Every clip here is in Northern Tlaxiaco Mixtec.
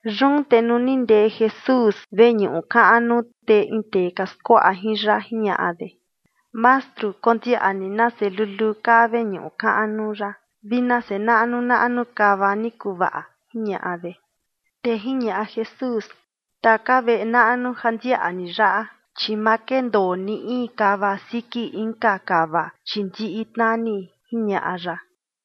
Yun te nuu ni ndee Jesús veñuꞌu kaꞌnu, te in tee ka skuaꞌa jin ya jiñaꞌa de: ―Mastru, kondiaꞌa ni nase luluu kaa veñuꞌu kaꞌnu yaꞌa vi nase naꞌnu naꞌnu kava ni kuvaꞌa, ―jiñaꞌa de. Te jiñaꞌa Jesús: ―Taka veꞌe naꞌnu ja ndiaꞌa ni yaꞌa, chi ma kendoo ni in kava siki inka kava, chi ndiꞌi tnani ―jiñaꞌa ya.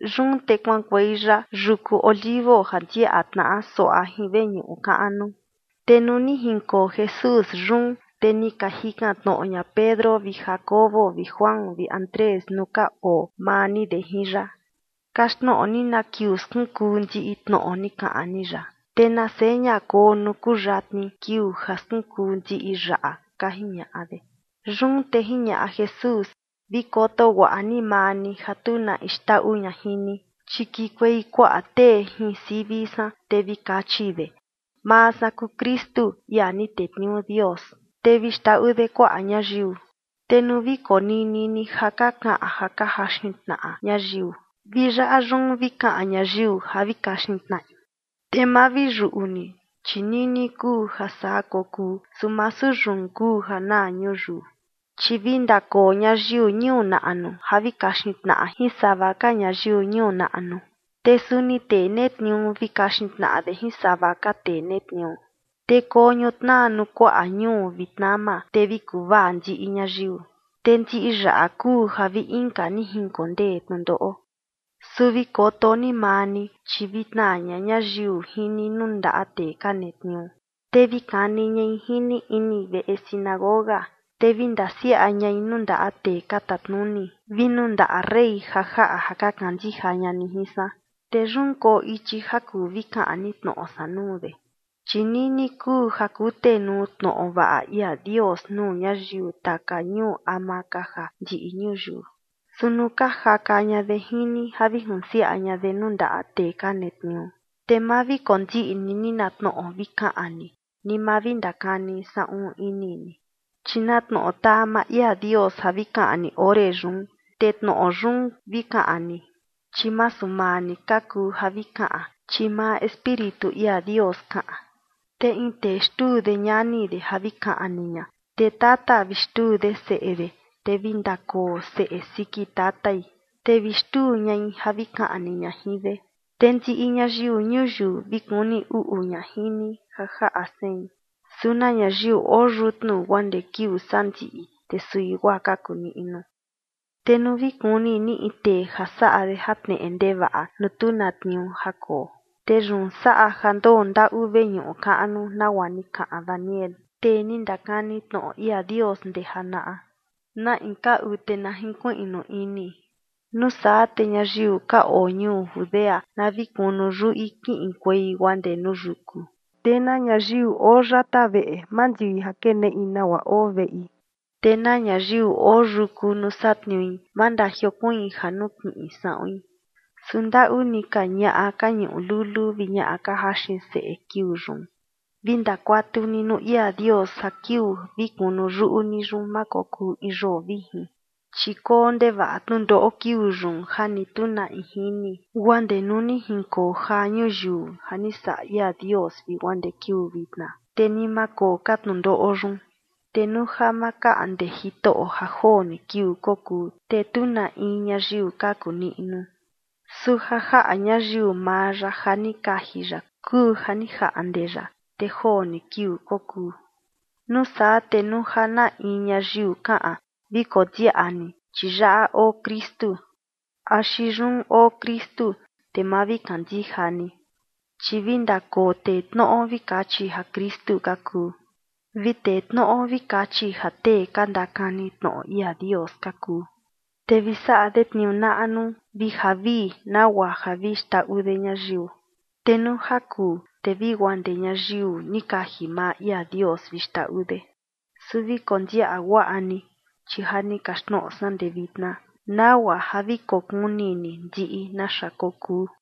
Yun te kuaꞌankuei ya yuku Olivo ja ndiaꞌa tnaꞌa suaꞌa jin veñuꞌu kaꞌnu. Te nuu ni jinkoo Jesús yun, te ni ka jikan tnoꞌo ña Pedro vi Jacobo vi Juan vi Andrés nuu ka oo maa ni de jin ya: ―Kaxtnoꞌo ni na kiuu skunkuu ndiꞌi tnoꞌo ni kaꞌan ni yaꞌa, te na seña koo nuu kuyatni kiuu ja skunkuu ndiꞌi yaꞌa ―ka jiñaꞌa de. Yun te jiñaꞌa Jesús: ―Vi koto guaꞌa ni maa ni ja tu na in xndaꞌu ña jin ni, chi kikuei kuaꞌa tee jin sivi san, te vi kachi de: “Maa san kuu Kristu, ia ni tetniuu Dios”. Te vi xndaꞌu de kuaꞌa ñayiu. ’Te nuu vi konini ni ja ka kaꞌan ja ka jaxin tnaꞌa ñayiu, vi yaꞌa yun vi kaꞌan ñayiu ja vi kaxin tnaꞌi, te ma vi yuꞌu ni, chi nini kuu ja saa kokuu, su masu yun kuu ja naa ñuyiu. Chi vi ndakoo ñayiu ñuu naꞌnu ja vi kaxin tnaꞌa jin sava ka ñayiu ñuu naꞌnu. Te suni tee netniuu vi kaxin tnaꞌa de jin sava ka tee netniuu. Te koo ñutnaa nuu kuaꞌa ñuu vi tnama, te vi kuvaa ndiꞌi ñayiu. Te ndiꞌi yaꞌa kuu ja vi inka ni jinkondee tnundoꞌo. ’Su vi koto ni maa ni, chi vi tnaa ña ñayiu jin ni nuu ndaꞌa tee ka netniuu, te vi kani ñai jin ni ini veꞌe sinagoga, te vi ndasiaꞌa ñai nuu ndaꞌa tee ka tatnuni vi nuu ndaꞌa rey ja jaꞌa ja ka kandija ña ni jin san, te yun koo ichi ja kuu vi kaꞌan ni tnoꞌo san nuu de. Chi nini kuu ja kutenuu tnoꞌo vaꞌa ia Dios nuu ñayiu taka ñuu ama ka ja ndiꞌi ñuyiu. Su nuu ka jaka ña de jin ni ja vi junsiaꞌa ña de nuu ndaꞌa tee ka netniuu, te ma vi kondiꞌni ni na tnoꞌo vi kaꞌan ni, ni ma vi ndakani saꞌun ini ni, chi na tnoꞌo taa maa ia Dios ja vi kaꞌan ni ore yun, te tnoꞌo yun vi kaꞌan ni, chi masu maa ni ka kuu ja vi kaꞌan, chi maa Espíritu ia Dios kaꞌan. Te in tee xtuu de ñani de ja vi kaꞌni ña, te tata vi xtuu de seꞌe de, te vi ndakoo seꞌe siki tatai, te vi xtuu ñai ja vi kaꞌni ña jin de. Te ndiꞌi ñayiu ñuyiu vi kuni uꞌu ña jin ni ja jaꞌa sein, su na ñayiu oo yutnu guaa ndee kiuu sandiꞌi, te sui guaa kaku niꞌnu. ’Te nuu vi kuni ni in tee ja saꞌa de jatneꞌe ndevaꞌa nuu tu na tniuu ja koo, te yun saꞌa ja ndoo ndaꞌu veñuꞌu kaꞌnu, nagua ni kaꞌan Daniel, tee ni ndakani tnoꞌo ia Dios ndee janaꞌa, na in kaꞌu, te na jinkuiꞌnu ini. Nuu saa, te ñayiu ka oo ñuu Judea na vi kunu yuꞌi kiꞌinkuei guaa ndee nuu yuku. Te na ñayiu oo yata veꞌe ma ndui ja keneꞌi nagua oo veꞌi. Te na ñayiu oo yuku nuu satniui, ma ndajiokuiin ja nukiꞌin saꞌuin. Su ¡ndaꞌu ni ka ñaꞌa ka ñuꞌu luluu vi ñaꞌa ka jaxin seꞌe kiuu yun! Vi ndakuatu ni nuu ia Dios ja kiuu vi kunu yuꞌu ni yun, ma kokuu in yoo vijin. Chi koo ndevaꞌa tnundoꞌo kiuu yun ja ni tu na in jini guaa ndee nuu ni jinkoo jaa ñuyiu ja ni saꞌa ia Dios vi guaa ndee kiuu vitna, te ni ma koo ka tnundoꞌo yun. Te nuu ja ma kaꞌnde Jitoꞌo ja joo ni kiuu kokuu, te tu na in ñayiu kaku niꞌnu, su ja jaꞌa ñayiu maa ya ja ni kaji ya kuu ja ni jaꞌnde ya, te joo ni kiuu kokuu. ’Nuu saa te nuu ja na in ñayiu kaꞌan: “Vi kondiaꞌa ni, chi yaꞌa oo Kristu”, axi “Yun oo Kristu”, te ma vi kandija ni. Chi vi ndakoo tee tnoꞌo vi kachi ja Kristu ka kuu, vi tee tnoꞌo vi kachi ja tee ka ndakani tnoꞌo ia Dios ka kuu, te vi saꞌa de tniuu naꞌnu vi javii, nagua ja vi xndaꞌu de ñayiu. Te nuu ja kuu, te vi guaa ndee ñayiu ni kaji maa ia Dios vi xndaꞌu de. Su vi kondiaꞌa guaꞌa ni, chi ja ni kaxtnoꞌo san ndee vitna nagua ja vi kokuni ni ndiꞌi naxa kokuu.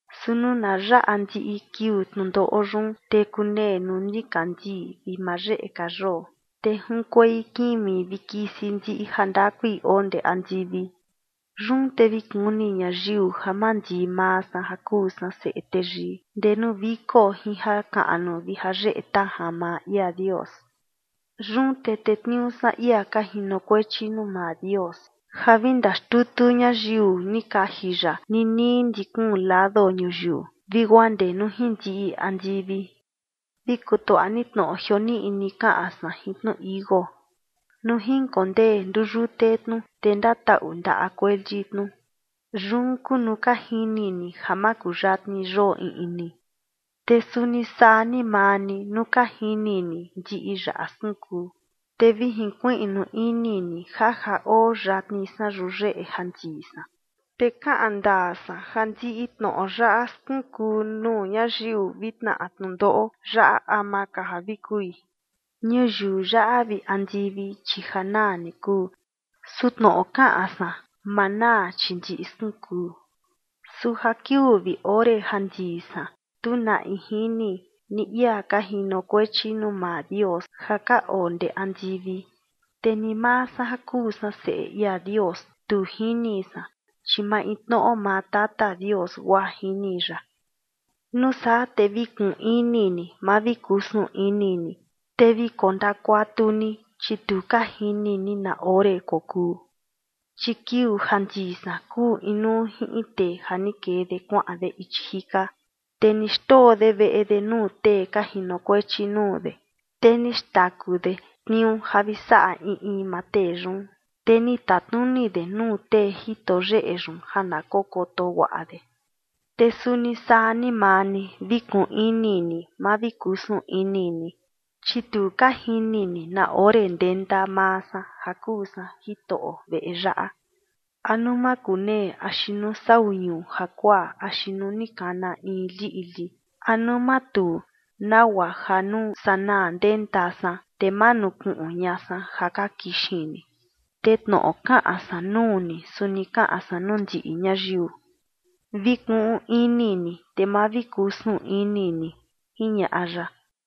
’Su nuu na yaꞌa ndiꞌi kiuu tnundoꞌo yun, te kunee nuu nikandii vi ma yeꞌe ka yoo, te junkuei kimi vi kisi ndiꞌi jandakui oo ndee andivi. Yun te vi kuni ñayiu ja mandii maa san ja kuu san Seꞌe Teyii ndee nuu viko jin jakaꞌnu vi jayeꞌe tajan maa ia Dios. Yun te tetniuu san ia ka jinokuechi nuu maa Dios ja vi ndaxtutu ñayiu ni kaji ya ninii ndi kuun lado ñuyiu vi guaa ndee nuu jin ndiꞌi andivi. ’Vi kutuaꞌa ni tnoꞌo jioniꞌni kaꞌan san jin tnu tichi iuu. Nuu jinkondee nduyute tnu, te ndataꞌu ndaꞌa kueli tnu, yun kuu nuu ka jini ni ja makuyatni yoo iꞌni. Te suni saa ni maa ni, nuu ka jini ni ndiꞌi yaꞌa skunkuu, te vi jinkuiꞌnu ini ni ja ja oo yatni san yuyeꞌe ja ndii san. Te kaꞌan ndaa san ja ndiꞌi tnoꞌo yaꞌa skunkuu nuu ñayiu vi tnaꞌa tnundoꞌo yaꞌa ama ka ja vi kui. Ñuyiu yaꞌa vi andivi, chi ja naa ni kuu. Su tnoꞌo kaꞌan san, ma naa, chi ndiꞌi skunkuu. ’Su ja kiuu vi ore ja ndii san, tu na in jini, ni ia ka jinokuechi nuu maa Dios ja ka oo ndee andivi, te ni maa san ja kuu san Seꞌe ia Dios, tu jini san, chi maintnoꞌo maa Tata Dios guaa jini ya. ’Nuu saa te vi kuꞌun ini ni, ma vi kusun ini ni, te vi kondakuatu ni, chi tu ka jini ni na ore kokuu. Chi kiuu ja ndii san kuu inuu jin in tee ja ni kee de kuaꞌan de ichi jika, te ni xndoo de veꞌe de nuu tee ka jinokuechi nuu de. Te ni xtaku de tniuu ja vi saꞌa in in maa tee yun. Te ni tatnuni de nuu tee jito yeꞌe yun ja na kokoto guaꞌa de. Te suni saa ni maa ni, vi kuꞌun ini ni, ma vi kusun ini ni, chi tu ka jini ni na ore ndenta maa san ja kuu san jitoꞌo veꞌe yaꞌa, a nuu makunee axi nuu sau ñuu jakuaa axi nuu ni kana in liꞌli, a nuu matuu, nagua ja nuu sanaa ndenta san, te ma nukuꞌun ña san ja ka kixin ni. Te tnoꞌo kaꞌan san nuu ni, suni kaꞌan san nuu ndiꞌi ñayiu: Vi kuꞌun ini ni, te ma vi kusun ini ni ―jiñaꞌa ya.